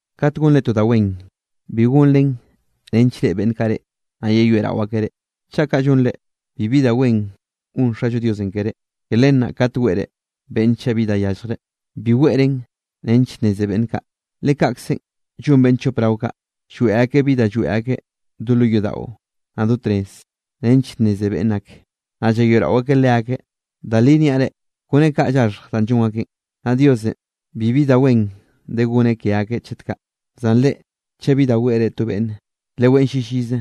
’Kat gonre to da wen, bi gonren nench reꞌe beꞌnn kaꞌ reꞌ, naꞌ yeyoeꞌrao akeꞌ reꞌ. Chaꞌ kaꞌ llonre, bibi da wen gon Xallo Diosenꞌ keré. Ke len naꞌ kat weꞌre beꞌnne chaꞌ bi da yalljreꞌ, bi weꞌren nench nneze beꞌnn kaꞌ. Le kaꞌkzenꞌ llon beꞌnn chop rao kaꞌ, lloeꞌ akeꞌ bi da lloeꞌ akeꞌ do lo yodaꞌo, naꞌ do tnez nench nneze beꞌnn ake, naꞌ llayoeꞌrao akeꞌ leakeꞌ. Da li niaꞌ reꞌ, kone kaꞌ llaxhj danꞌ llon akeꞌ, naꞌ Diosenꞌ bibi da wen de goneꞌ ke akeꞌ chet kaꞌ. Zan reꞌ, chaꞌ bi da weꞌre to beꞌnne, leweꞌn llillize.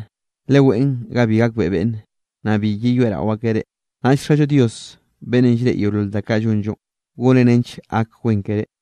Leweꞌn ga bi gakbeꞌe beꞌnne, naꞌ bi yeyoeꞌrao akeꞌ reꞌ, naꞌll Xallo Dios beꞌnnenꞌ llreꞌe yeolol da kaꞌ llonllonꞌ, goneꞌ nench gak wen keré.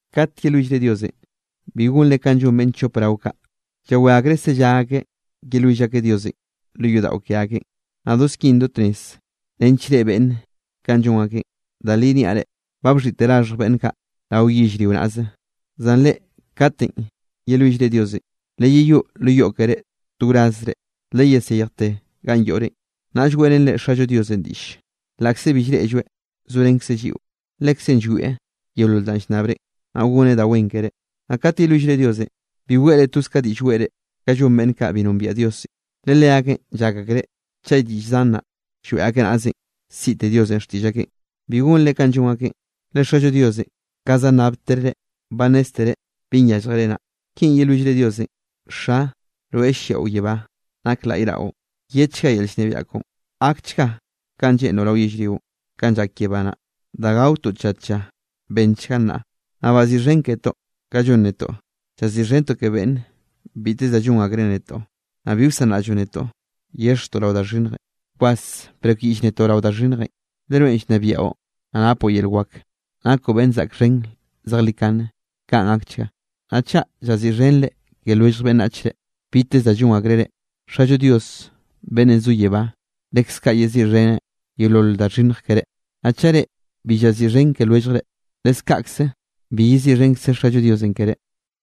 ’Kat yelwillre Diosenꞌ, bi gonre kanꞌ llon beꞌnn chop rao kaꞌ, llawé akreꞌ sellá akeꞌ yelwill akeꞌ Diosenꞌ lo yodaꞌo ke akeꞌn, naꞌ do skin do tnez, nench reꞌe beꞌnne kanꞌ llon akeꞌn. Da li niaꞌ reꞌ, ba bxhiꞌte raxhj beꞌnn kaꞌ rao yellrio naꞌze. Zan reꞌ katenꞌ yelwillre Diosenꞌ, leyeyoꞌ lo yoꞌ keré to wrazre, leyesejte ganꞌ yoꞌrenꞌ, naꞌll weꞌrenre Xallo Diosenꞌ diꞌll, laꞌkze bi llreꞌlloeꞌ, zorenkzeꞌ lliꞌo, Lekzeꞌn llwieꞌ yeolol danꞌ llnnabrenꞌ, naꞌ goneꞌ da wen keré. ’Naꞌ kat yelwillre Diosenꞌ, bi weꞌre toz ka diꞌll weꞌre kanꞌ llon beꞌnn kaꞌ bi nombiaꞌ Diosenꞌ. Le leakeꞌn llak akreꞌ chaꞌ diꞌll zan naꞌ lloeꞌ akeꞌ naꞌzenꞌ, siꞌte Diosenꞌ xtiꞌll akeꞌn. Bi gonre kanꞌ llon akeꞌn, le Xallo Diosenꞌ, ka za nnábtere, ba nnéztereꞌ binꞌ yálljere naꞌ. Kinꞌ yelwillre Diosenꞌ: Xa, rweꞌ lliaꞌo yebá, nak laꞌy raꞌon. Yedchga yel llnebiaꞌ koꞌon. Gakchga kanꞌ lleꞌnroꞌ rao yellrionꞌ kanꞌ llak yebá naꞌ. Danꞌ gaotoꞌ tlla tlla bennchgan nnaꞌ. Naꞌ baziꞌxhen ketoꞌ kanꞌ llon netoꞌ, llaziꞌxhentoꞌ ke beꞌnne biteze da llon akreꞌ netoꞌ. Naꞌ bi wsanraꞌlloꞌ netoꞌ yexjtoꞌ rao da xhinnjenꞌ, bkwas brekyiꞌll netoꞌ rao da xhinnjenꞌ. Le rweꞌn llnebiaꞌo, naꞌ napoꞌ yel wak, nakoꞌ beꞌnn zaꞌk xhen zejlikane. Kaꞌn gakchga. ’Naꞌ chaꞌ llaziꞌxhenre ke lwellj beꞌnnachre biteze da llon akreꞌ reꞌ, Xallo Dios beꞌnnenꞌ zo yebá, leskaꞌ yeziꞌxheneꞌ yeolol da xhinnj keré. Naꞌ chaꞌ reꞌ bi llaziꞌxhen ke lwelljre, leskaꞌkze bi yeziꞌxhenkze Xallo Diosenꞌ keré.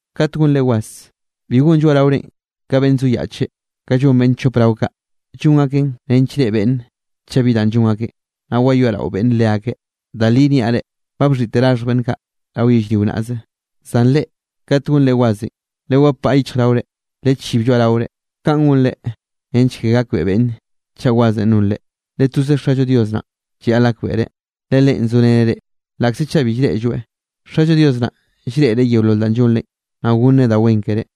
’Kat gonre was, bi gon lloaꞌraorenꞌ ka beꞌnn zoyaꞌche, kanꞌ llon beꞌnn chop rao kaꞌ. Llon akeꞌ nench reꞌe beꞌnn chaꞌ bi danꞌ llon akeꞌ, naꞌ wayoeꞌrao beꞌnn leakeꞌ. Da li niaꞌ reꞌ, ba bxhiꞌte raxhj beꞌnn kaꞌ rao yellrio naꞌze. Zan reꞌ, kat gonre wasenꞌ, lewapaꞌ yichjraore, lechib lloaꞌraore. Kaꞌn gonre nench ke gakbeꞌe beꞌnne chaꞌ wasenꞌ nonre, le toze Xallo Dios naꞌn llayaꞌl gakbeꞌreꞌ, le Leꞌen zoreneꞌ reꞌ, laꞌkze chaꞌ bi llreꞌlloeꞌ. Xallo Dios naꞌn llreꞌreꞌ yeolol da llonrenꞌ, naꞌ goneꞌ da wen keré.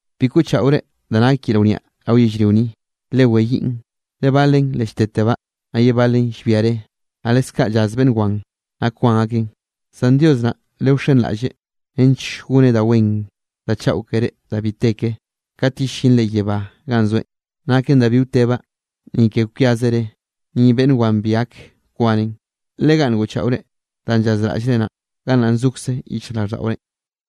’Bi koꞌchaꞌore da nak yel wniaꞌ rao yellrio ni, le weyiꞌn. Le balen le lltetebaꞌ, naꞌ ye balen llbia re, naꞌ leskaꞌ llaz beꞌnn wan, naꞌ kwan akeꞌn. Zan Dios naꞌ lewxenraꞌlleꞌ nench gonneꞌ da wen da chaꞌo keré da bi te ke, kat yellinre yebá ganꞌ zoeꞌn, naken da bi wtebaꞌ, ni ke kwiaze re, ni beꞌnn wan bi gak kwanen. Le ganꞌ ngoꞌchaꞌore danꞌ llazraꞌllre naꞌn, gannaꞌn zokze yichjraꞌlldaꞌorenꞌ.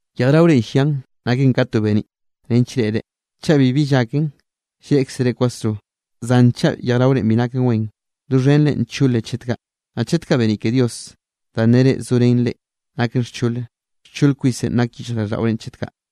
’Yejraore llian naken ka to beniꞌ nench reꞌre. Chaꞌ bibi llaken, llreꞌkzere kwasro. Zan chaꞌ yejraorenꞌ bi naken wen, doxhenre ncholen chet kaꞌ. Naꞌ chet kaꞌ beniꞌ ke Dios danꞌ nere zorén reꞌ naken xchole, xchol kwisenꞌ nak yichjraꞌlldaꞌore chet kaꞌ.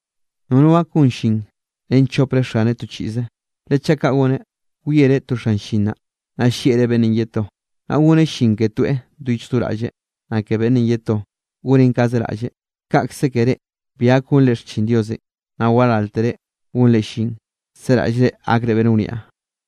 ’Nono gak gon llin ren chopre xaneꞌ to chiꞌze, le chaꞌ kaꞌ goneꞌ, wiereꞌ to xan llin naꞌ, naꞌ llieꞌreꞌ beꞌnnenꞌ ye to; naꞌ goneꞌ llin ke toeꞌ do yichj do raꞌlleꞌ, naꞌ ke beꞌnnenꞌ ye to, goneꞌn kaze raꞌlleꞌ. Kaꞌkze ke reꞌ bi gak gonre xchin Diosenꞌ, naꞌ waráltere gonre llin, seraꞌllre gakre beꞌnn wniaꞌ.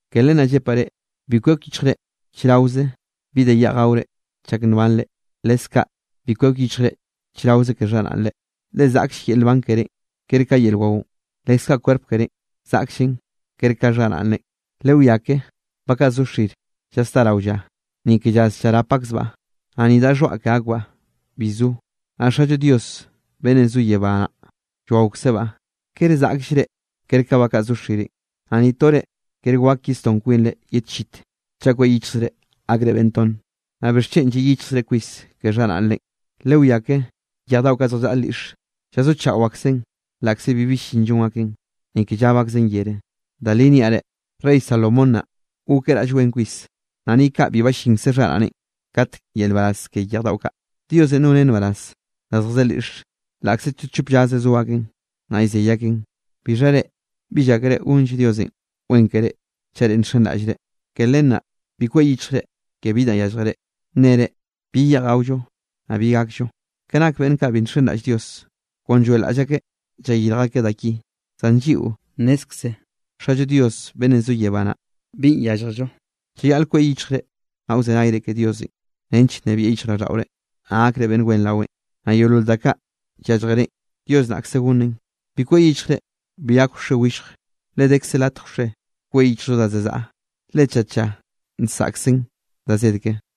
’Ke len naꞌ llepaꞌ reꞌ, bi kwek yichjre chraoze bi da yeꞌj gaore chak nbanre, leskaꞌ bi kwek yichjre chraoze ke xharaꞌnre. Le zaꞌkll yel nban kerénꞌ ker ka yel waonꞌ. Lekze kaꞌ kwerp kerénꞌ, zaꞌkllen ker ka xharaꞌnrenꞌ. Lewiá ke ba kaꞌ zo xir llasdá rao lla, ni ke llaz llarap akzbaꞌ, naꞌ ni daꞌ xhoaꞌ ke akbaꞌ bi zo, naꞌ Xallo Dios beꞌnnenꞌ zo yebá naꞌ llwaokzebaꞌ. ¿Kere zaꞌkllre ker ka ba kaꞌ zo xirenꞌ? Naꞌ ni tore kere wak yesdón kwinre ye tchit, chaꞌ kweꞌ yichjzre gakre beꞌnn tonne. ’Naꞌ ¿bixchen lliꞌ yichjzre kwis ke xharaꞌnre? Lewiá ke yej daꞌo zjallaꞌa lyiꞌxe, llazochaꞌo aksen laꞌkze bibi llin llon aken, ni ke llab akzen yere. Da li niaꞌ reꞌ, rey Salomón naꞌ, gokeꞌ raꞌll wen kwis, naꞌ ni kaꞌ bi ballinkze xharaꞌneꞌn katk yel nbaraz ke yej daꞌo kaꞌ. Diosenꞌ noneꞌ nbaraz da zjadé lyiꞌxe laꞌkze to chop llaze so aken, naꞌ llzey akeꞌn. Bixha reꞌ, ¿bi llákere gonlle Diosenꞌ wen keré chaꞌ reꞌ nxenraꞌllreꞌ? Ke len naꞌ bi kweꞌ yichjre ke bi danꞌ yálljere, nere: “¿Bi yeꞌj gaollo, naꞌ bi gakllo?” Ke nak beꞌnn kaꞌ bi nxenraꞌll Dios, kon lloeꞌlaꞌll akeꞌ llayirj akeꞌ da ki. Zan lliꞌo, nnézkze Xallo Dios beꞌnnenꞌ zo yebá naꞌ binꞌ yálljello. Llayaꞌle kweꞌ yichjre, naꞌ wzenayre ke Diosenꞌ nench nnebieꞌ yichjraꞌlldaꞌore, naꞌ gakre beꞌnn wen raweꞌn. Naꞌ yeolol da kaꞌ yálljerenꞌ, Dios naꞌkze gonneꞌn. Bi kweꞌ yichjre bi gak wxe willje, le dekze latj wxe, kweꞌ yichjllo da za zaꞌa. Le tlla tlla nsaꞌkzen da zed ke.